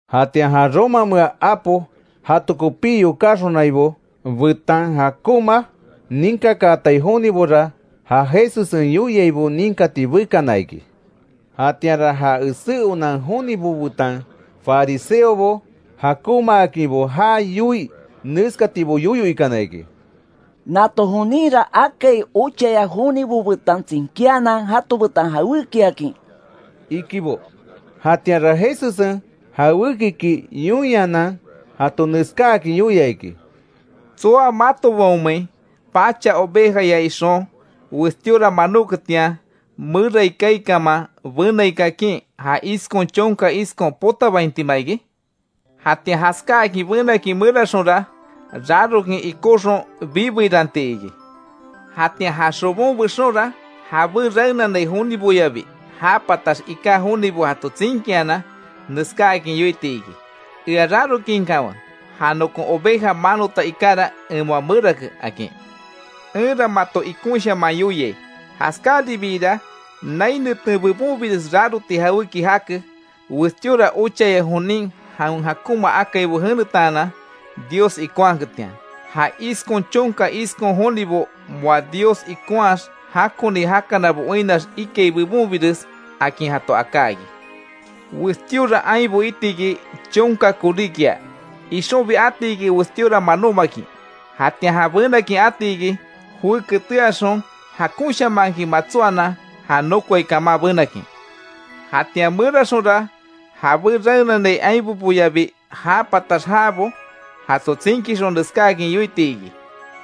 Jatian ja Romamea apo jato kopí yokáxonaibo, betan jakonma ninkakaatai jonibora, ja Jesussen yoiaibo ninkati bekana iki. Jatianra ja esé onan jonibo betan fariseobo, jakonmaakinbo já yoii neskatibo yoyo ikana iki: —Nato joninra akai ochaya jonibo betan tsinkíanan jato betan jawékiakin —ikibo. Jatianra Jesussen jawékiki yoinhanan jato neskáakin yoia: “¿Tsoa matobaonmein, pacha ovejaya ixon, westíora manóketian, merai kaai kaman, benai kakin ja iskon chonka iskon potabaintima iki? Jatian jaskáakin benakin meraxonra, rarokin ikóxon bibeiranti iki. Jatian ja xobon bexonra, jabé raenanai joniboyabi já patax iká jonibo jato tsinkianan, neskáakin yoiti iki: ‘Ea rarokinkanwe, ja nokon oveja manota ikara, en moa merake’, akin. Enra mato ikonshaman yoiai; Jaskáribiira nai neten bebonbires raroti jawéki jake, westíora ochaya jonin jawen jakonma akaibo jenetaanan Dios ikonhaketian; ja iskon chonka iskon jonibo moa Dios ikonhaax jakoni jakanabo oinnax ikai bebonbires, akin jato aká iki. Westíora ainbo iti iki; chonka koríkia, ixonbi ati iki westíora manómakin. Jatian ja benakin ati iki; joé keteaxon, jakonshamankin matsóanan, ja nokoai kaman benakin. Jatian meraxonra jabé raenanai ainboboyabi já patax jaabo jato tsinkixon neskáakin yoiti iki: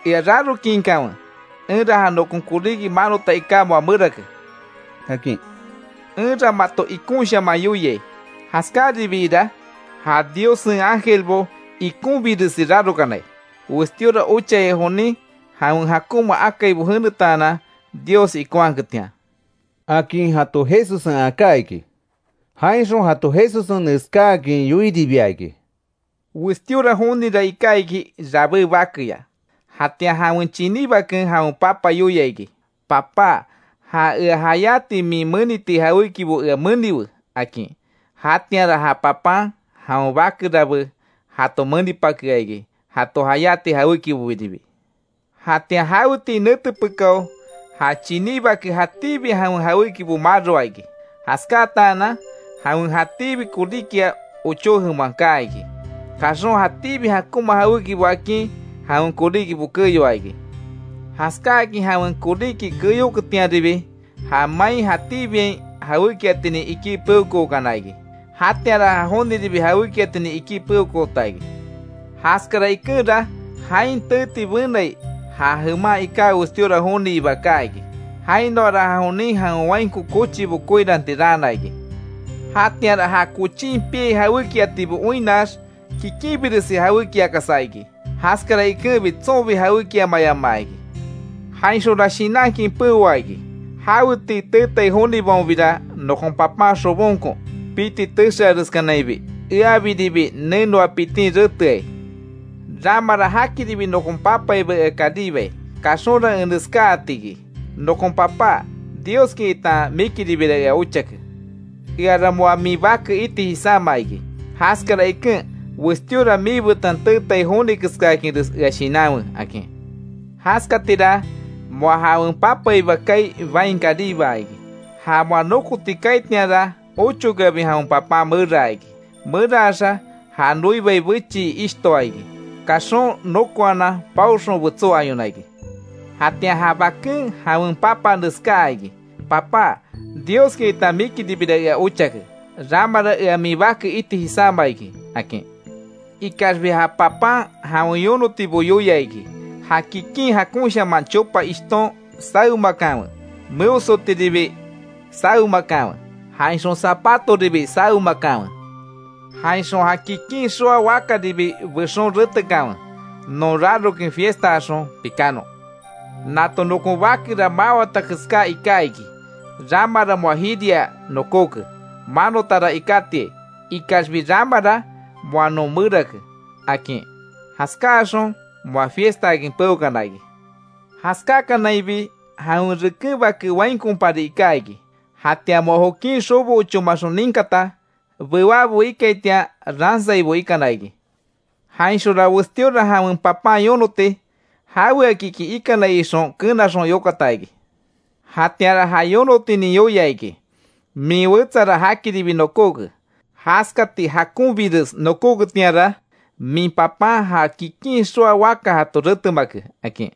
‘Ea rarokinkanwe, enra ja nokon koríki manota iká moa merake’, akin. Enra mato ikonshaman yoiai; jaskáribiira ja Diossen ángelbo ikonbiresi rarokanai, westíora ochaya jonin jawen jakonma akaibo jenetaanan, Dios ikonhaketian”, akin jato Jesussen aká iki. Jainxon jato Jesussen neskáakin yoiribia iki: “Westíora jonira iká iki rabé bakeya. Jatian jawen chiní baken jawen papa yoia iki: ‘Papá, ja ea jayáti min meniti jawékibo ea meniwe’, akin. Jatianra ja papan, jawen bake rabé jato menipakea iki, jato jayáti jawékibobiribi. Jatian jawetii nete pekáo, ja chiní bake jatíbi jawen jawékibo maroa iki; jaskátaanan jawen jatíbi koríkia, ochó jeman kaa iki; kaxon jatíbi jakonma jawékibo akin, jawen koríkibo keyoa iki. Jaskáakin jawen koríki keyoketianribi, ja main jatíbiain jawékiatinin ikí, peokookana iki. Jatianra ja joniribi jawékiatinin ikí peokoota iki. Jaskara ikenra jain teeti benai, ja jeman iká westíora joniiba kaa iki. Jainoara ja jonin jawen wainko kochibo koiranti raana iki. Jatianra ja kochin piai jawékiatibo oinnax, kikinbiresi jawékiakasa iki; jaskara ikenbi tsonbi jawékiamayamaa iki. Jainxonra shinankin peoa iki: ‘¡Jawetii teetai jonibaonbira nokon papan xobonko, piti texeareskanainbi, eabiribi nenoa pitin reteai! Ramara jakiribi nokon papaiba ea karibai. Kaxonra en neskáati iki: Nokon papá, Dioski itan mikiribira ea ochake. Eara moa min bake iti jisáma iki; jaskara iken westíora miibetan teetai joni keskáakinres ea shinanwe’, akin. Jaskatira moa jawen papaiba kaai, bain karibaa iki. Ja moa nokoti kaaitianra, ochokeabi jawen papan meraa iki. Meraxa já noibai bechii ishtoa iki. Kaxon nokoanan paoxon betsó ayona iki. Jatian ja baken jawen papa neskáa iki: ‘Papá, Dioski itan mikiribira ea ochake. Ramara ea min bake iti jisáma iki’, akin. Ikaxbi ja papan jawen yonotibo yoia iki: ‘Ja kikin jakonshaman chopa ishton sawemakanwe, meosotiribi sawemakanwe, jainxon zapatoribi sawemakanwe. Jainxon ja kikin xoa wakaribi bexon retekanwe. ¡Non rarokin fiestaaxon pikánon! Nato nokon bakera mawata keská iká iki, ramara moa jiria nokóke. Manotara ikátiai, ikaxbi ramara moa non merake’, akin. Jaskaaxon moa fiestaakin peokana iki. Jaskákanainbi, jawen reken bake, wainkopari iká iki. Jatian moa jokin xobo ochómaxon ninkata, bewábo ikaitian ransaibo ikana iki. Jainxonra westíora jawen papan yonoti; jaweakiki ikanai ixon kenaxon yokata iki. Jatianra ja yonotinin yoia iki: ‘Min wetsara jakiribi nokóke, jaskati jakonbires nokóketianra min papan, ja kikin xoa waka jato retemake’, akin.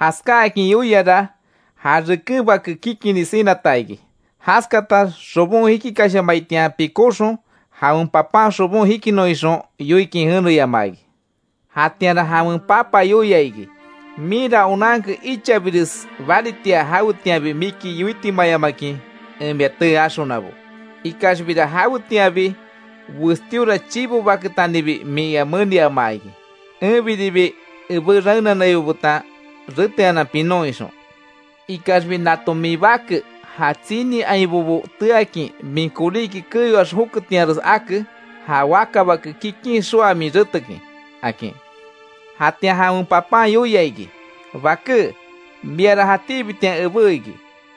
Jaskáakin yoiara, ja reken bake kikini sinata iki; jaskatax xobon jikikashamaitian, pikóxon jawen papan xobon jikinon ixon yoikin jeneyamaa iki. Jatianra jawen papa yoia iki: ‘Minra onanke ichabires baritia, jawetianbi miki yoitimayamakin en mia tee axonabo; ikaxbira jawetianbi, westíora chivo baketanibi min ea meniama iki, enbiribi ebé raenanaibo betan reteanan pinon ixon. Ikaxbi, nato min bake, ja tsini ainbobo teakin, min koríki keyoax joketianres ake, ja wakabake kikin xoa min retekin’, akin. Jatian jawen papan yoia iki: ‘Baké, miara jatíbitian ebé iki.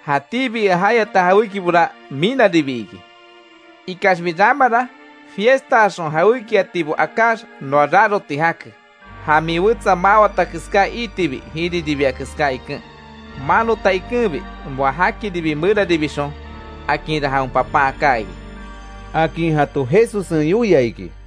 Jatíbi ea jayata jawékibora minaribi iki. Ikaxbi ramara, fiestaaxon jawékiatibo akáx noa raroti jake. Ja min wetsa mawata keská iitibi jiriribia keská iken, manota ikenbi, moa jakiribi meraribixon, akinra jawen papan aká iki’”, akin jato Jesussen yoia iki.